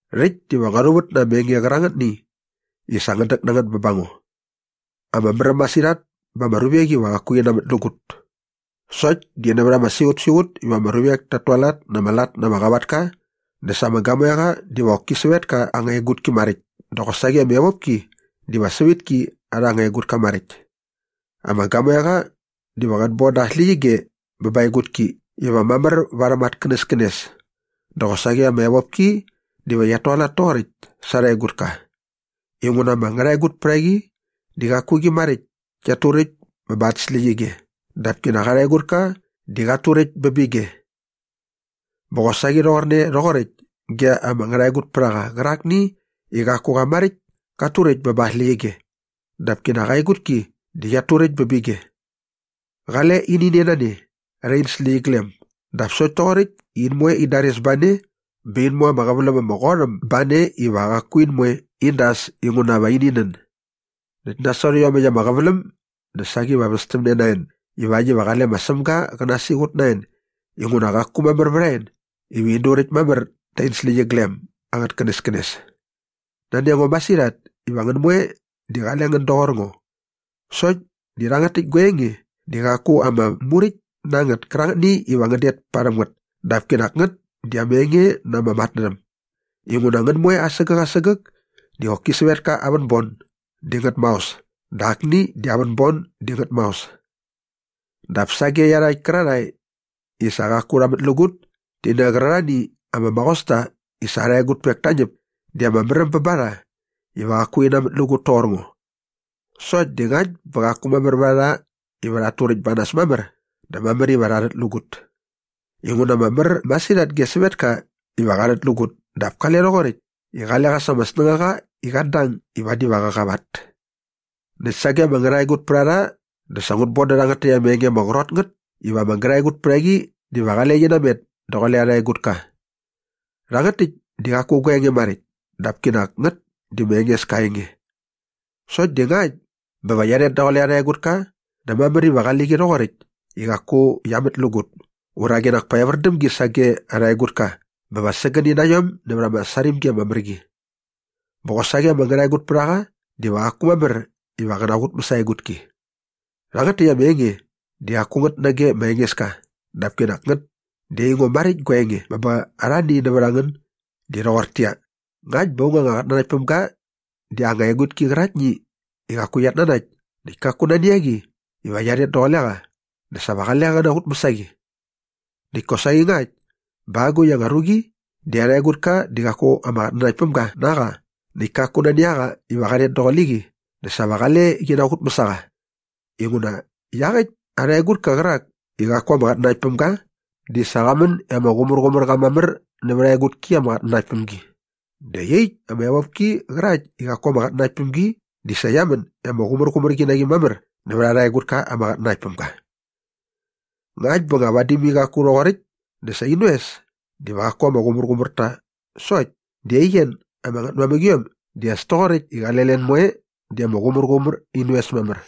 Rhäkt diva ngua rhuvät na ama enge qärangätni i sa ngän däk na ngät bä ba ngo. Ama märäm masirhat ba ama ruvek iva qaku rhi namätlägut. Sokt di nävät ama siqutsiqut iva ama ruvek tat tualat na ama lat na ama qavatka dä sa ama gamoeqa diva qoki sävetka aa anga egutki maräkt dä qosaqi ama evopki diva sävitki arha anga egutka maräkt. Ama gamoeqa diva qät bon da aa släqyige bä ba aa egutki iva mamär varhäm at känäskänes dä qosaqi ama evopki diva qiat tualat toqoräkt sa arha egutka. Inguna ama ngärhaegutpärhaqi di qaku qi maräkt kiat turäkt bä ba at släqyige dap kinak arha egutka di qat turäkt bä bä ige. Bä qosaqi rhoqorne rhoqoräkt ge ama ngärhaegutpärhaqa qärakni i qaku qa maräkt kat turäkt bä ba aa släqyige dap kinak aa egutki di qiat turäkt bä bä ige. Qale ini nen a ne rhä in släqyiglem dap sokt toqoräkt i in moe in dares ba ne bä in mu ama qäväläm ama qot äm ba ne iva qaku in moe in das inguna va ini nän. Näkt nasot iomäkt ama qäväläm dä saqi va västämne na en ivakt iva qale ma Sämga qä nasiqut na en inguna qaku mamär vät a en iva in durakt mamär tä in släqyiglem angät känäskänes. Nani a ngo masirhat iva ngän moe di qale ngän doqor ngo. Sokt di rhangät täkt gua enge di qaku ama muräkt na ngät kärangätni iva ngän det parhäm ngät dap kinak ngät di ama enge na ama matnärhäm. Inguna ngän moe asägäk asägäk di qoki sävetka aa vänbon di ngät maos dä akni di aa vänbon di ngät maos. Dap sage iarhakt kärarhae i sa qaku rha mätlägut ti nä qärarhani ama maqosta i sa arha egutpek ta ñäp di ama märäm bä ba rha iva qaku rhi namätlägut toqor ngo. Sokt di ngakt bä qaku mamär vät a rha iva rhat turäkt ba nas mamär dä mamär iva rha rhätlägut. Inguna ama mär masirhat ge sävetka iva qa rhätlägut dap kale rhoqoräkt i qale qa sa ama snängaqa i qat dang i vadi va qä qavat. Näkt sage ama ngärhaegutpärharha dä sa ngut bon dä rhangät täkt ama enge ama qrot ngät iva ama ngärhaegutpärhaqi diva qale qi namet daqule arha egutka. Rhangät täkt di qaku gua enge maräkt dap kinak ngät di ma Engeska aa enge. Sokt di ngakt bä va qia rhet daqule arha egutka dä mamär iva qali qi rhoqoräkt i qaku qia mätlägut ura qinak pa evär däm gi sage arha egutka bä va sägäni na iom nävät ama sarimgi ama mär qi. Bä qosaqi ama ngärhaegutpärhaqa diva qaku mamär iva qä naqutmäs aa egutki. Rhangät täkt ama enge di qaku ngät nage ma Engeska dap kinak ngät di aingo maräkt gua enge bä ba arhani nävät a ngän di rhoqortäqyia, ngakt bä aung anga qatnanaktpämga di aa anga egutki qäraktni i qaku qiat nanakt näkt kaku nani a qi iva qia rhet daqule qa dä sa va qale qä naqutmäs a qi. Näkt kosaqi ngakt bä agukt anga ruqi di arha egutka di qaku ama qatnanaktpämga na qa näkt kaku nani a qa iva qa rhet daqule qi dä sa va qale qi naqutmäs a qa. Inguna iaqäkt arha egutka qärak i qaku ama qatnanakt päm ga di sa qa män i ama qumärqumär qa mamär nävät aa egutki ama qatnanakt päm gi dä iaqyäkt ama evopki qärakt i qaku ama qatnanakt päm gi di sa qia män i ama qumärqumär qi mamär nävät arha egutka ama qatnanakt päm ga. Ngakt bä nga vadi mai qaku rhoqoräkt dä sa in oes diva qaku ama qumärqumär ta sokt di aien ama ngätmamäqiom di as toqoräkt i qale len moe di ama qumärqumär in oes mamär.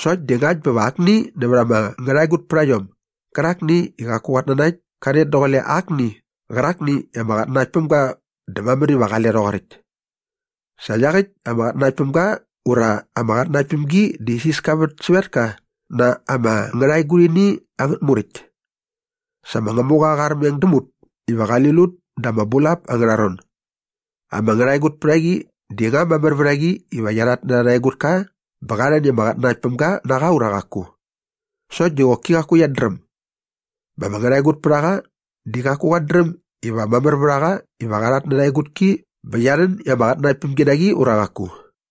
Sokt di ngakt bä va akni nävät ama ngärhaegutpärhaiom gärakni i qaku qat nanakt ka rhet daqule akni qärakni i ama qatnanakt päm ga dä mamär iva qale rhoqoräkt. Sa iaqäkt ama qatnanaktpämga ura ama qatnanaktpämgi di isiska vät sävetka na ama ngärhaegurhini angät muräkt. Sa ma Ngämuqa qa armeng däm ut iva qali lut da aa bulap angärha ron. Ama ngärhaegutpärhaqi di nga mamär vät a qi iva qia rhatnärha arha egutka bä qa rhän i ama qatnanaktpämga na qa ura qaku? Sokt di qoki qaku qiat dräm. Bä ama ngärhaegutpärhaqa di qaku qat dräm iva mamär vät a qa iva qa rhatnärha aa egutki bä qia rhän i ama qatnanaktpämgi na qi ura qaku.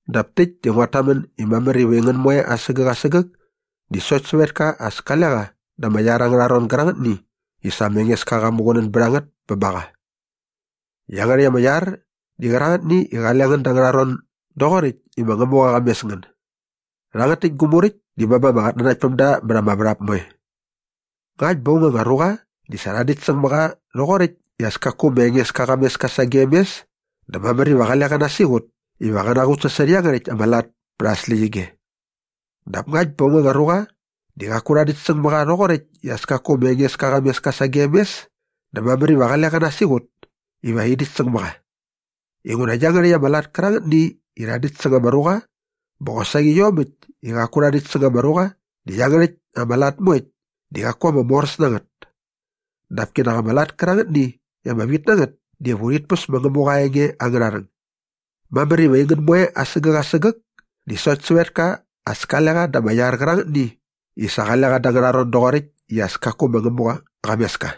Dap täkt di nguat tamän i mamär iva ngän moe asägäk asägäk di sokt sävetka as kale qa da ama iar angärha ron gärangätni i sa ma Engeska qa muqunän bät a ngät bä ba qa. Iangärhäkt ama iar di qärangätni i qale ngän da angärha ron doqoräkt i ma Ngämuqa qa mes ngän. Rhangät täkt gu muräkt di bä ba ama qatnanaktpämda mät ama värhap moe. Ngakt bä aung anga ruqa di sa rha däkt säng mä qa rhoqoräkt i as kaku ma Ngämuqa qa mes ka sagem mes dä mamär iva qale qä nasiqut iva qä qutsasot iangärhäkt ama lat pät aa släqyige. Dap ngakt bä aung anga ruqa di qaku rha däkt säng mä qa rhoqoräkt i as kaku ma Ngämuqa qa mes ka sagem mes dä mamär iva qale qä nasiqut iva rhi däkt säng mä qa. Inguna iangärhäkt ama lat kärangätni i rha däkt säng ama ruqa bä qosaqi iomäkt i qaku rha däkt säng ama ruqa di iangärhäkt ama lat moekt di qaku ama moräs na ngät. Dap kinak ama lat kärangätni i ama vit na ngät diva urhit päs ma Ngämuqa aa enge angärha rhäng. Mamär iva aingän moe asägäk asägäk di sokt sävetka as kale qa da ama iar qärangätni i sa qale qa da angärha ron doqoräkt i as kaku ma Ngämuqa qa mes ka.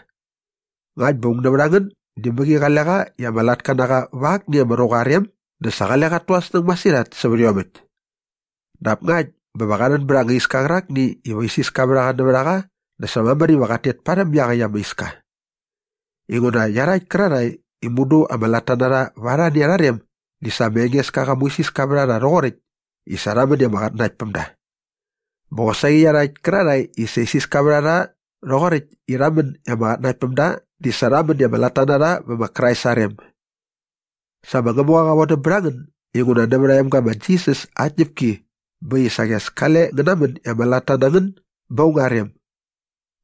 Ngakt bä aung nävät a ngän di mäqi qale qa i ama latka na qa va akni ama ruqa aa rem dä sa qale qat tu aa snäng masirhat sävät iomäkt. Dap ngakt bä va qa rhän bät anga iska qärakni iva isiska vät a qa nävät a qa dä sa mamär iva qat tet parhäm iaqäkt ama iska. Inguna iarhakt kärarhae i mudu ama latta na rha va arhani arha rem di sa ma Engeska qa muisiska vät a rha rhoqoräkt i sa rha män i ama qatnanaktpämda. Bä qosaqi iarhakt kärarhae i sa isiska vät a rha rhoqoräkt i rha män i ama qatnanaktpämda di sa rha män i ama latta vä ma Krais aa rem. Sa ma Ngämuqa qa vodäm bät a ngän inguna nävät aa emga ma Jisas aa tñäpki bä äkt i saqi as kale ngän namän i ama latta na ngän bä aung aa rem.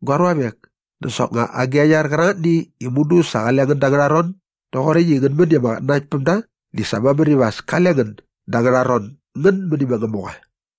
Gua ruavek, dä soknga agi a iar qärangätni i mudu sa qale ngän da angärha ron doqoräkt i ngän män i ama qatnanaktpämda di sa mamär iva as kale ngän da angärha ron ngän mäni ma Ngämuqa.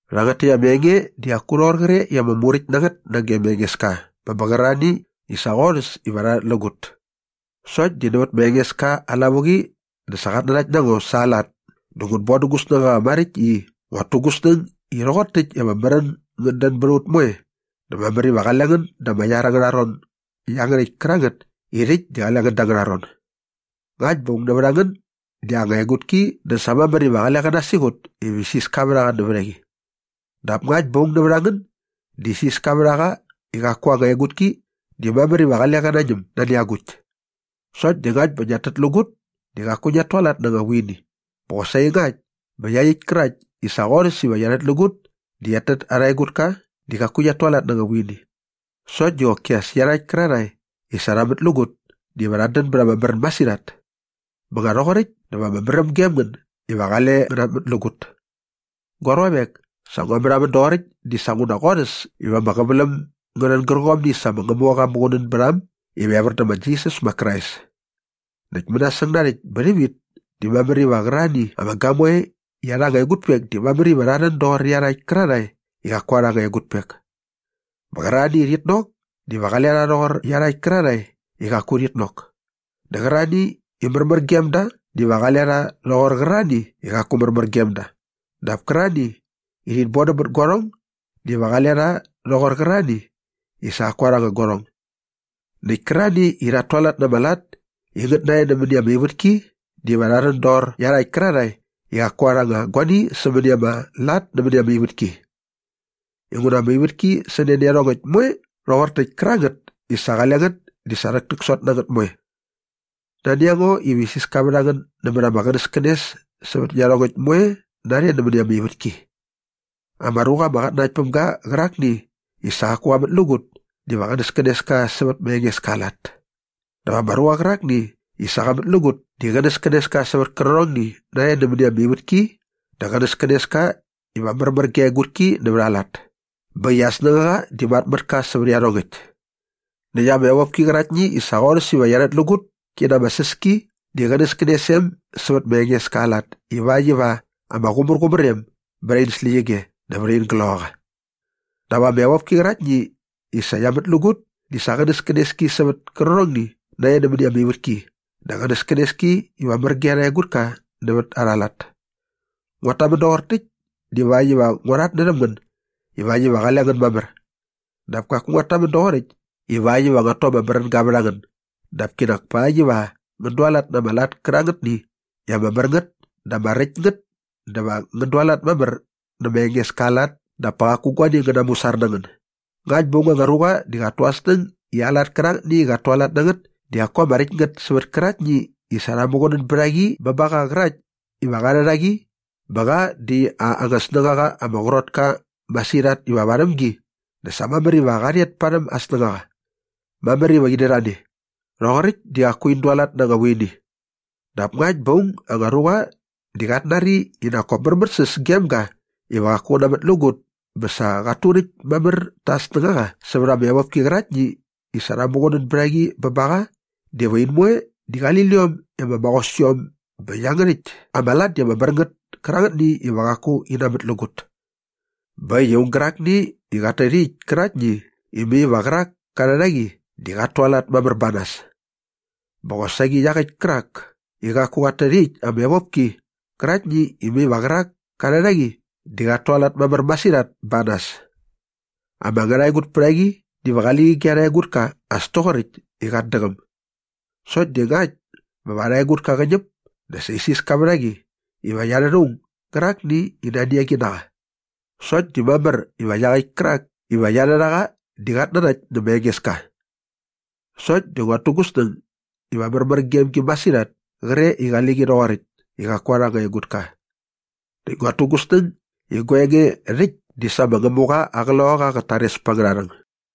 Rhangät täkt ama enge di qaku rhoqor qre i ama muräkt na ngät nage ma Engeska bä bä qärarhani i sa qorhäs iva rha rhätlägut. Sokt di nävät ma Engeska aa lavuqi dä sa qat nanakt na ngo sa aa lat dä ngut bon dä gu snängaqa maräkt i nguat tu gu snäng i rhoqor täkt i ama märän ngät dän bät a ut moe dä mamär iva qale ngän da ama iar angärha ron iangärhäkt kärangät i rhäkt di qale ngän da angärha ron. Ngakt bä aung nävät a ngän di aa anga egutki dä sa mamär iva qale qä nasiqut iva isiska vät a qa nävät a qi. Dap ngakt bä aung nävät a ngän di isiska vät a qa i qaku aa anga egutki di mamär iva qale qä nañäm nani agukt. Sokt di ngakt bä ngiat tätlägut di qaku ngiat tualat na anga vuini bä qosaqi ngakt bä iaqyäkt kärakt i sa qorhäs iva qia rhätlägut di qiat tät arha egutka di qaku qiat tualat na anga vuini. Sokt di qoki as iarhakt kärarhae i sa rha mätlägut diva rhat dän bät ama märän masirhat. Bä nga rhoqoräkt dä va ama märäm gem ngän iva qale ngän namätlägut. Gua ruavek, sa ngua märhamän doqoräkt dinguna sa qorhäs iva ama qäväläm ngä rhän gärqomni i sa ma Ngämuqa qa muqunän bät a äm iva evär dä ma Jisas ma Krais. Näkt mänasäng narhäkt bä rhävit di mamär iva qärarhani ama gamoe i arha anga egutpek di mamär iva rha rhän doqor iarhakt kärarhae i qaku arha anga egutpek. Bä qärarhani i rhit nok diva qale rha rhoqor iarhakt kärarhae i qaku rhit nok dä qärarhani i märmär gem da diva qale rha rhoqor qärarhani i qaku märmär gem da dap kärarhani i rhit bodäm bät guarhong diva qale rha rhoqor qärarhani i sa qaku arha anga qärhong. Näkt kärarhani i rhat tualat na ama lat i ngät narhe nämäni ama ivätki diva rha rhän doqor iarhakt kärarhae i qaku arha anga guani sämäni ama lat nämäni ama ivätki. Inguna ama ivätki sä ne nä iarhongäkt moe rhoqor täkt kärangät i sa qale ngät di sa rhäktäksot na ngät moe. Nani a ngo iva isiska vät a ngän nämät ama qänäskänes sävät iarhongäkt moe narhe nämäni ama ivätki. Ama ruqa ama qatnanakt päm ga qärakni i sa qaku qa mätlägut diva qänäskänes ka sävät ma Engeska aa lat. Dap ama ruqa qärakni i sa qa mätlägut di qänäskänes ka sävät kärqärhongni narhe nämäni ama ivätki dä qänäskänes ka iva märmär ge aa egutki nävät aa lat bä äkt i aa snängaqa di mat mät ka sävät iarhongäkt. Näkt ama evopki qäraktni i sa qorhäs iva qia rhätlägut ki na ama säs ki di qänäskänes em sävät ma Engeska aa lat ivakt iva ama qumärqumär em bät in släqyige dä vät in gloqaqa. Dap ama evopki qäraktni i sa qia mätlägut di sa qänäskänes ki sävät kärqärhongni narhe nämäni ama ivätki dä qänäskänes ki iva märmär ge arha egutka nävät arha lat. Nguat tamän doqor täkt divakt iva ngua rhatnärhäm ngän ivakt iva qale ngän mamär. Dap kaku nguat tamän doqoräkt ivakt iva nguat tu ama märänga vät a ngän dap kinak pakt iva ngän dualat na ama lat kärangätni i ama mär ngät dä ama räkt ngät dä va ngän dualat mamär nä ma Engeska aa lat dap pa qaku guani ngä namusar na ngän. Ngakt bä aung anga ruqa di qat tu aa snäng i aa lat kärangätni i qat tualat na ngät di qaku ama räkt ngät sävät kärakt i sa rha muqunän bät a qi bä ba qa qärakt iva qa rhät a qi bä qa di aa anga snängaqa ama qrot ka masirhat iva varhäm gi dä sa mamär iva qa rhet parhäm aa snängaqa. Mamär iva in dät a ne. Rhoqoräkt di qaku in dualat na anga vuini. Dap ngakt bä aung anga ruqa di qat nari i nak kop märmärsäs gem ga iva qaku qä namätlägut bä sa qat turäkt mamär ta aa snängaqa sävät ama evopki qäraktni i sa rha muqunän bät a qi bä ba qa diva in moe di qali liom i ama maqos iom bä iangärhäkt ama lat di ama mär ngät kärangätni iva qaku in namätlägut. Bä äkt i aung gärakni i qat tät iaqyäkt käraktni i mai va qärak ka rhät a qi di qat tualat mamär ba nas. Bä qosaqi iaqäkt kärak i qaku qat tät iaqyäkt ama evopki qäraktni i mai va qärak ka rhät a qi di qat tualat mamär masirhat ba nas. Ama ngärhaegutpärhaqi diva qali qi ge arha egutka as toqoräkt i qat däqäm. Sokt di ngakt bä va arha egutka qä ñäp dä sa isiska vät a qi iva qia rhät aung gärakni i nani a qi na qa. Sokt di mamär iva iaqäkt kärak iva qia rhät a qa di qat nanakt nä ma Engeska. Sokt di nguat tu gu snäng iva märmär gem gi masirhat kre i qali qi rhoqoräkt i qaku arha anga egutka. Näkt nguat tu gu snäng i gua enge rhäkt di sa ma Ngämuqa aa Qloqaqa qat tares pät angärha rhäng.